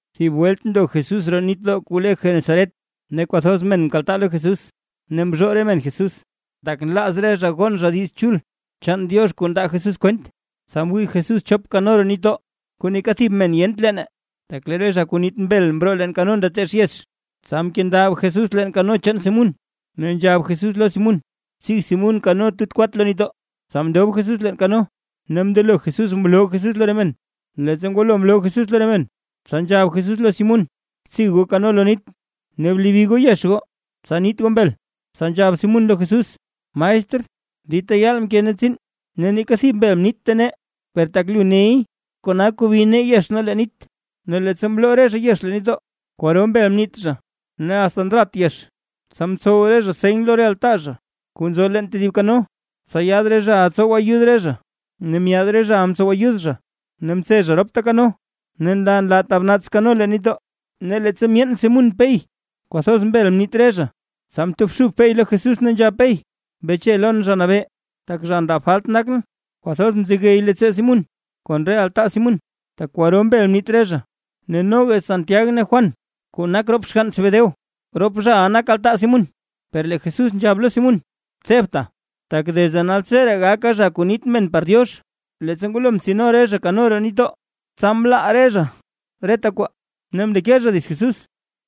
Thib welt ndo Jesús roo nitdoo kuu le Genesaret, ne kwathoz men mkaltaa lo Jesús ne mzhoo re men Jesús, tak nlaaz re zha gon zha Diiz Chul chaan Diox kuu ndaa Jesús kwent. Tsa mwii Jesús chop kano roo nitdoo, kuu neeka thib men yent leene, tak lee re zha kuu niit mbel mroo leen kano ndateech yex. Tsa mkendab Jesús leen kano chaan Simún, ne nzhab Jesús lo Simún tsig Simún kano tut kwat lo nitdoo. Tsa mndob Jesús leen kano, ne mndelo Jesús mloo Jesús lo re men. Leettsa ngwalo mloo Jesús lo re men, tsa nzhab Jesús lo Simún: ―Btsig goo kano lo nit, ne blebi goo yex goo, tsa niit goo mbel. Tsa nzhab Simún lo Jesús: ―Maestr, dita yaal mke nee tsiin ne neeka thib mbel mniitta nee, per tak lu ney, kona kobi nee yex nee leen nit. Ne leettsa mloo re zha yex leen nitdoo, kwaro mbel mniit zha, ne asta ndrat yex. Tsa mtsow re zha seny lo re altaa zha kuu nzo leen tedib kano, tsa yaad re zhaʼa tsow ayud re zha. Ne myaad re zhaʼa mtsow ayud zha, ne mtse zha ropta kano, ne nlaa nlaa tab naats kano leen nitdoo. Ne leettsa myeen Simún Pey kwathoz mbel mniit re zha, tsa mtobxub Pey lo Jesús ne nzhab Pey: ―¡Beche lon, Zha Nabee, tak zha ndab falt nakʼn! Kwathoz mzegey leettsoo Simún kon re altaa Simún, tak kwaro mbel mniit re zha. Ne noga Santiag ne Juan kuu nak rop xgann Zebedeo, rop zhaʼa nak altaa Simún. Per lee Jesús nzhab lo Simún: ―Tsebta, tak desde naltseree gaka zha kuu niit men par Diox. Leettsa ngwalo mtsino re zha kano roo nitdoo, tsa mlaa zha reta kwaa ne mndeke zha dits Jesús.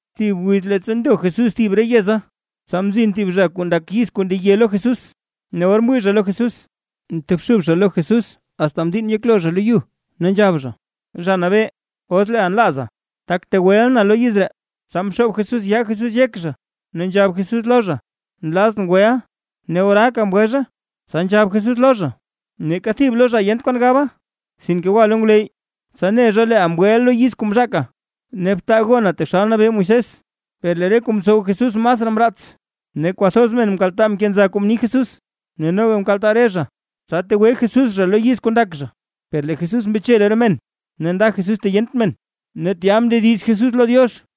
Thib wiz leettsa ndo Jesús thib re yeza, tsa mzin thib zha kuu ndak yiz kuu ndeye lo Jesús, ne or mwii zha lo Jesús, mtobxub zha lo Jesús asta mdiinn yeklo zha lo yu, ne nzhab zha: ―Zha Nabee, os leeʼa nlaaza, tak tegweʼa na lo yiz ree. Tsa mxoob Jesús yaa Jesús yek zha, ne nzhab Jesús lo zha: ―Nlazʼn weʼa. Ne oraaka mgwe zha. Tsa nzhab Jesús lo zha: ―Neeka thib lo zha yent kwan gaba. Sinke gwa lo ngwleyy, tsa ne zha leeʼa mgweʼa lo yiz kuu mzhaaka, ne btaa gona taxal mnabee Moisés. Per lee re kuu mtsow Jesús masraa mraats, ne kwathoz men mkaltaa mkenza kuu mni Jesús, ne noga mkaltaa re zha tsa tegwe Jesús zha lo yiz kuu ndak zha. Per lee Jesús mbeche lo re men ne nda Jesús ta yent men, ne tya mndediz Jesús lo Diox.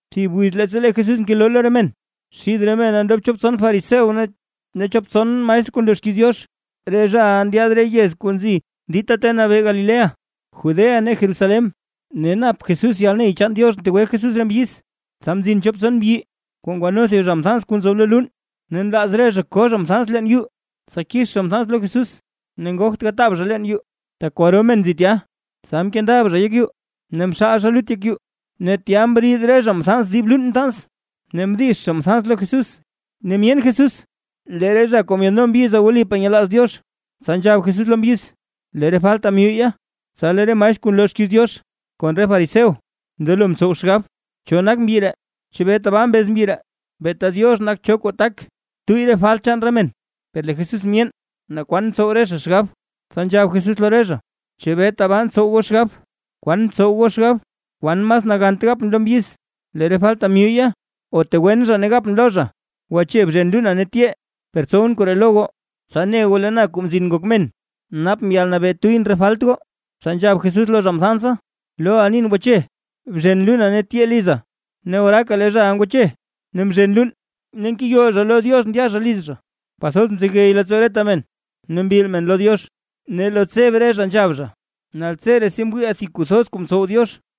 Thib wiz leettsa lee Jesús ngeloo lo re men, xid re mena ndob chop tson fariseo ne chop tson maestr kuu nloo xkiiz Diox, re zhaʼa ndyaad re yez kuu nzi dita ta nabee Galilea, Judea ne Jerusalén, ne nap Jesús yalney chaan Diox ntegwe Jesús re mbyiz. Tsa mzin chop tson mbyi kuu ngwano thib zha mthans kuu nzoob lo luun, ne nlaaz re zha ko zha mthans leen yuu, tsa kix zha mthans lo Jesús. Ne ngogt gataab zha leen yuu, tak kwaro men nzi tya, tsa mkendab zha yek yuu, ne mxaal zha lut yek yuu, ne tya mriid zha dib luun mthans, ne mdix zha mthans lo Jesús. Ne myeen Jesús lee re zha kuu myaadno mbyiza wlipaa nyelaaz Diox, tsa nzhab Jesús lo mbyiz: ―Lee re falta myuyya. Tsa lee re maestr kuu nloo xkiiz Diox kon re fariseo mndelo mtsow xgab: “¿Cho nak mbyi ree? ¿Chebee tabaa mbez mbyi ree? Beeta Diox nak cho kuu tak tuyy re falt chaan re men.” Per lee Jesús myeen naa kwan ntsow re zha xgab, tsa nzhab Jesús lo re zha: ―¿Chebee tabaa ntsow goo xgab? ¿Kwan ntsow goo xgab? ¿Kwan mas nagant gapʼn lo mbyiz: “Lee re falta myuyya”, o tegwen zha ne gapʼn lo zha: “Gwache, bzhen luuna ne tyee”? Per tsowʼn koree lo goo, tsa ne goo lee na, Kuu Mzin Ngok Men, napʼn yalnabee tuyʼn re falt goo. Tsa nzhab Jesús lo zha mthansa: ―Loʼa nin, gwache, bzhen luuna ne tyee liza. Ne oraaka lee zhaʼa ngwache, ne mzhen luun, ne ngeyol zha lo Diox ndya zha liz zha. Kwathoz mzegey leettsoo reta men ne mbil men lo Diox, ne lo tseb re zha nzhab zha: ―¡Naltseree si mwiiʼaa thib kuu thoz kuu mtsow Diox!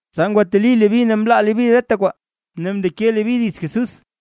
Tsa ngwateli Leví ne mlaa Leví reta kwaa, ne mndeke Leví dits Jesús.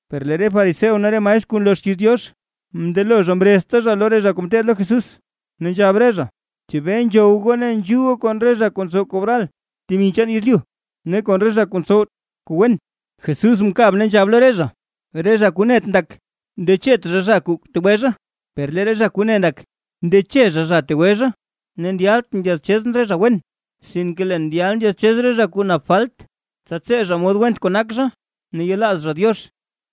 Per lee re fariseo ne re maestr kuu nloo xkiiz Diox, mndelo zha mrezta zha loo re zha kuu ngeteed lo Jesús, ne nzhab re zha: ―¿Chebee nzhow goo ne nzhuu goo kon re zha kuu ntsow kobral temi chaan yezlyu, ne kon re zha kuu ntsowt kuu wen? Jesús mkab ne nzhab lo re zha: ―Re zha kuu net ndak, ndechet zha zha kuu tegwe zha, per lee re zha kuu ne ndak, ndeche zha zha kuu tegwe zha. Ne ndyaltʼn ndyaadchezʼn re zha wen, sinke leen ndyal ndyaadchez re zha kuu nap falt, tsa tsee zha mod went kuu nak zha ne yelaaz zha Diox.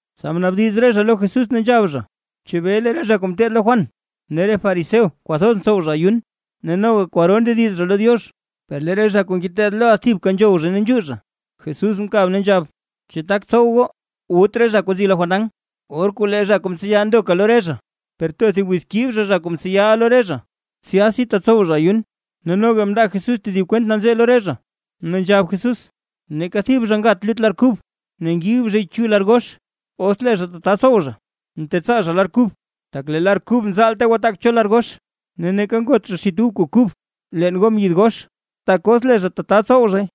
Tsa mnaabdiz re zha lo Jesús, ne nzhab zha: ―¿Chebee lee re zha kuu ngeteed lo Juan ne re fariseo kwathoz ntsow zha ayun, ne noga kwaro ndediz zha lo Diox, per lee re zha kuu ngeteed loʼa thibka nzhow zha ne nzhuu zha? Jesús mkab ne nzhab: ―¿Chu tak tsow goo, wut re zha kuu nzi lo fandan, or kuu lee zha kuu mtseya ndoka lo re zha? Per too thib wiz kib zha zha kuu mtseyaʼa lo re zha, tsyasi tatsow zha ayun. Ne noga mndaa Jesús thib kwent nanzee lo re zha, ne nzhab Jesús: ―Neeka thib zha ngat lut lar kub, ne ngib zhay chu lar gox. Os lee zha tata tsow zhay, ntetsaa zha lar kub, tak lee lar kub nzaalte gwataak cho lar gox. Ne neeka ngot zha xit ub kuu kub leen gom yid gox. Tak os lee zha tata tsow zhay,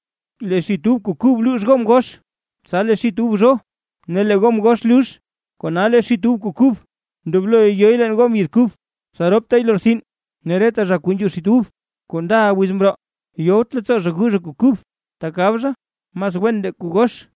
lee xit ub kuu kub luux gom gox. Tsa lee xit ub zho ne lee gom gox lux. Kona lee xit ub kuu kub ndobloy yo leen gom yid kub, tsa roptay lortsin. Ne reta zha kuu nzhuu xit ub kuu ndaʼa wiz mroo, yowt leettsoo zha gu zha kuu kub, tak gab zha: “Mas wen ndee kuu gox”.